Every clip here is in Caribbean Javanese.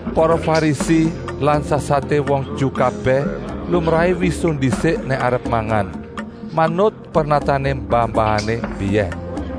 Para Farisi lan sasaté wong Ju kabèh lumrahé wisuh ndisik nèk arep mangan, manut pernatané mbah-mbahané mbiyèn.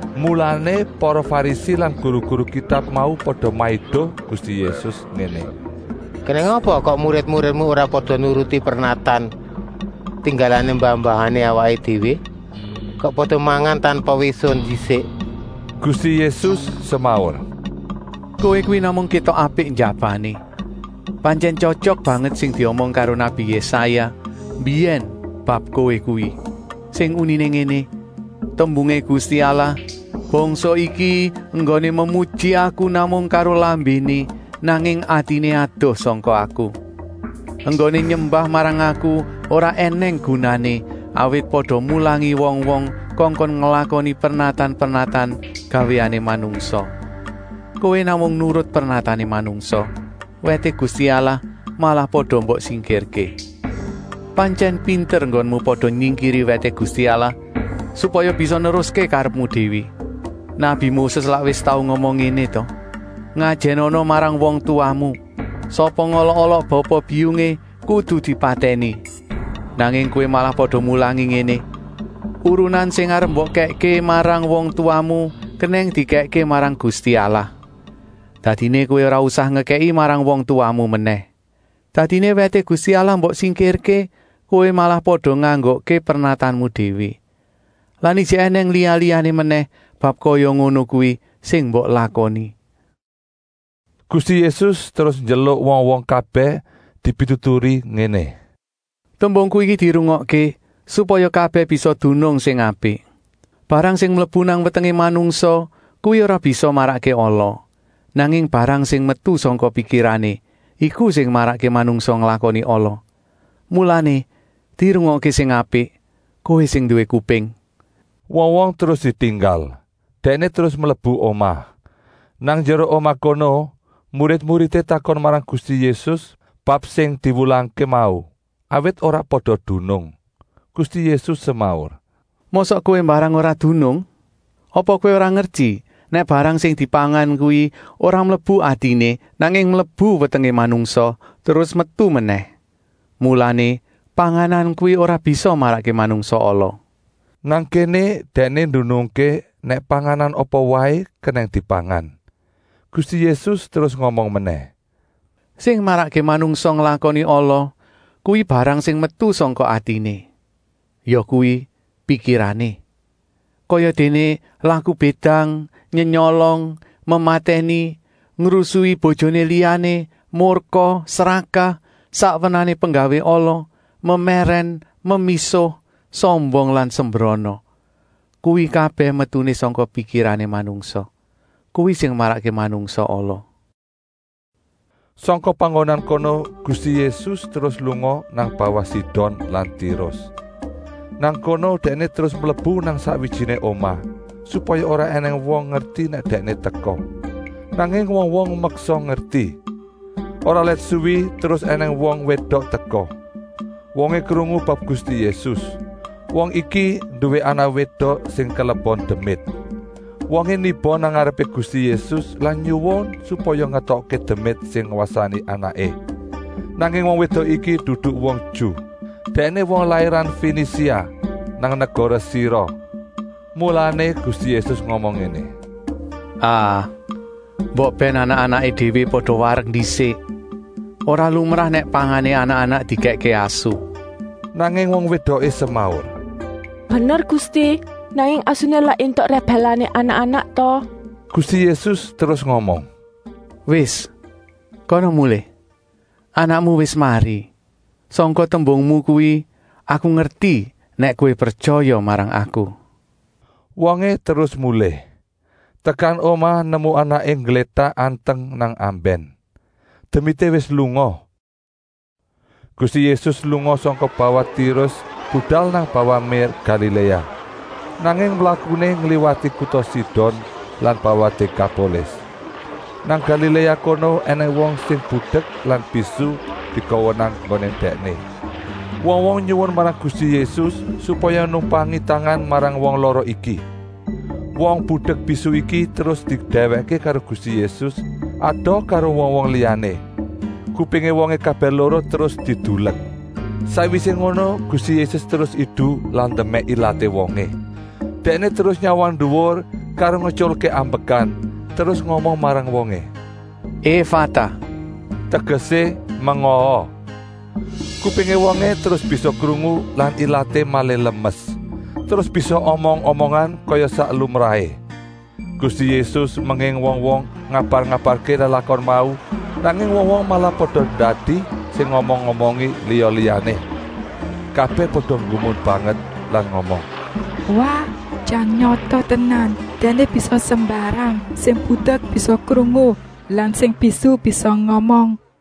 Mulané para Farisi lan guru-guru Kitab mau pada maido Gusti Yésus ngéné: “Kenèng apa kok murid-muridmu ora pada nurut pernatan tinggalané mbah-mbahané awaké déwé? Kok pada mangan tanpa wisuh ndisik?” Gusti Yésus semaur: “Kowé kuwi namung kétok apik njabané. Pantyèn tyotyok banget sing diomong karo nabi Yésaya mbiyèn bab kowé kuwi, sing uniné ngéné: ‘Tembungé Gusti Allah: Bangsa iki enggoné memuji Aku namung karo lambéné, nanging atiné adoh sangka Aku!’ ‘Enggoné nyembah marang Aku ora ènèng gunané, awit pada mulangi wong-wong kongkon nglakoni pernatan-pernatan gawéané manungsa.’ “Kowé namung nurut pernatané manungsa, wèté Gusti Allah malah pada mbok singkirké. “Pantyèn pinter nggonmu pada nyingkiri wèté Gusti Allah, supaya bisa neruské karepmu déwé. Nabi Moses lak wis tau ngomong ngéné ta: ‘Ngajènana marang wong tuwamu. Sapa ngolok-olok bapa-biyungé kudu dipatèni.’ Nanging kowé malah pada mulangi ngéné: Urunan sing arep mbok kèkké marang wong tuwamu kenèng dikèkké marang Gusti Allah. Dadiné kowé ora usah ngekèki marang wong tuwamu menèh. Dadiné wèté Gusti Allah mbok singkirké, kowé malah pada nganggokké pernatanmu déwé. Lan ijik ènèng liya-liyané menèh bab kaya ngono kuwi sing mbok lakoni!” Gusti Yésus terus nyeluk wong-wong kabèh dipituturi ngéné: “Tembungku iki dirungokké, supaya kabèh bisa dunung sing apik. Barang sing mlebu nang wetengé manungsa kuwi ora bisa marakké ala, nanging barang sing metu sangka pikirané, iku sing marakké manungsa nglakoni ala. ( Mulané, dirungokké sing apik, kowé sing nduwé kuping.”) Wong-wong terus ditinggal, Dèkné terus mlebu omah. Nang njero omah kono murid-muridé takon marang Gusti Yésus bab sing diwulangké mau, awit ora pada dunung. Gusti Yésus semaur: “Mosok kowé mbarang ora dunung. Apa kowé ora ngerti nèk barang sing dipangan kuwi ora mlebu atiné, nanging mlebu wetengé manungsa terus metu menèh. Mulané panganan kuwi ora bisa marakké manungsa ala.” (Nang kéné Dèkné ndunungké nèk panganan apa waé kenèng dipangan.) Gusti Yésus terus ngomong menèh: “Sing marakké manungsa nglakoni ala kuwi barang sing metu sangka atiné, yakuwi pikirané. Kayadéné laku bédang, nyenyolong, mematèni, ngrusui bojoné liyané, murka, srakah, sak wernané penggawé ala, memèrèn, memisuh, sombong lan sembrana.” Kuwi kabèh metuné sangka pikirané manungsa. Kuwi sing marakké manungsa ala. Sangka panggonan kono Gusti Yésus terus lunga nang bawah Sidon lan Tirus. Nang kono Dèkné terus mlebu nang sakwijiné omah, supaya ora ènèng wong ngerti nèk Dèkné teka. Nanging wong-wong meksa ngerti. Ora let suwi terus ènèng wong wédok teka. Wongé krungu bab Gusti Yésus. Wong iki nduwé anak wédok sing kelebon demit. Wongé niba nang ngarepé Gusti Yésus lan nyuwun supaya ngetokké demit sing ngwasani anaké. Nanging wong wédok iki dudu wong Ju, dèkné wong lairan Fenisia nang negara Siro. Mulané Gusti Yésus ngomong ngéné: “Ah, mbok bèn anak-anaké déwé pada warek ndisik. Ora lumrah nèk pangané anak-anak dikèkké asu!” Nanging wong wédoké semaur: “Bener Gusti, nanging asuné lak éntuk rèbèlané anak-anak ta?” Gusti Yésus terus ngomong: “Wis, kana mulih. Anakmu wis mari. Sangka tembungmu kuwi Aku ngerti nèk kowé pretyaya marang Aku!” Wongé terus mulih. Tekan omah nemu anaké ngglétak anteng nang ambèn. Demité wis lunga. Gusti Yésus lunga sangka bawah Tirus budal nang bawah mér Galiléa. Nanging mlakuné ngliwati kuta Sidon lan bawah Dékapolis. Nang Galiléa kono ènèng wong sing budek lan bisu digawa nang nggoné Dèkné. Wong-wong nyuwun marang Gusti Yésus supaya numpangi tangan marang wong lara iki. Wong budek-bisu iki terus didèwèkké karo Gusti Yésus, adoh karo wong-wong liyané. Kupingé wongé kabèh loro terus didulek. Sakwisé ngono Gusti Yésus terus idu lan ndemèk ilaté wongé. Dèkné terus nyawang nduwur karo ngetyulké ambekan, terus ngomong marang wongé: “Efata!” Tegesé: “Mengaa!” Kupingé wongé terus bisa krungu lan ilaté malih lemes, terus bisa omong-omongan kaya sak lumrahé. Gusti Yésus menging wong-wong ngabar-ngabarké lelakon mau, nanging wong-wong malah pada ndadi sing ngomong-omongi liya-liyané. Kabèh pada nggumun banget lan ngomong: “Wah, jan nyata tenan. Dèkné bisa sembarang. Sing budek bisa krungu lan sing bisu bisa ngomong.”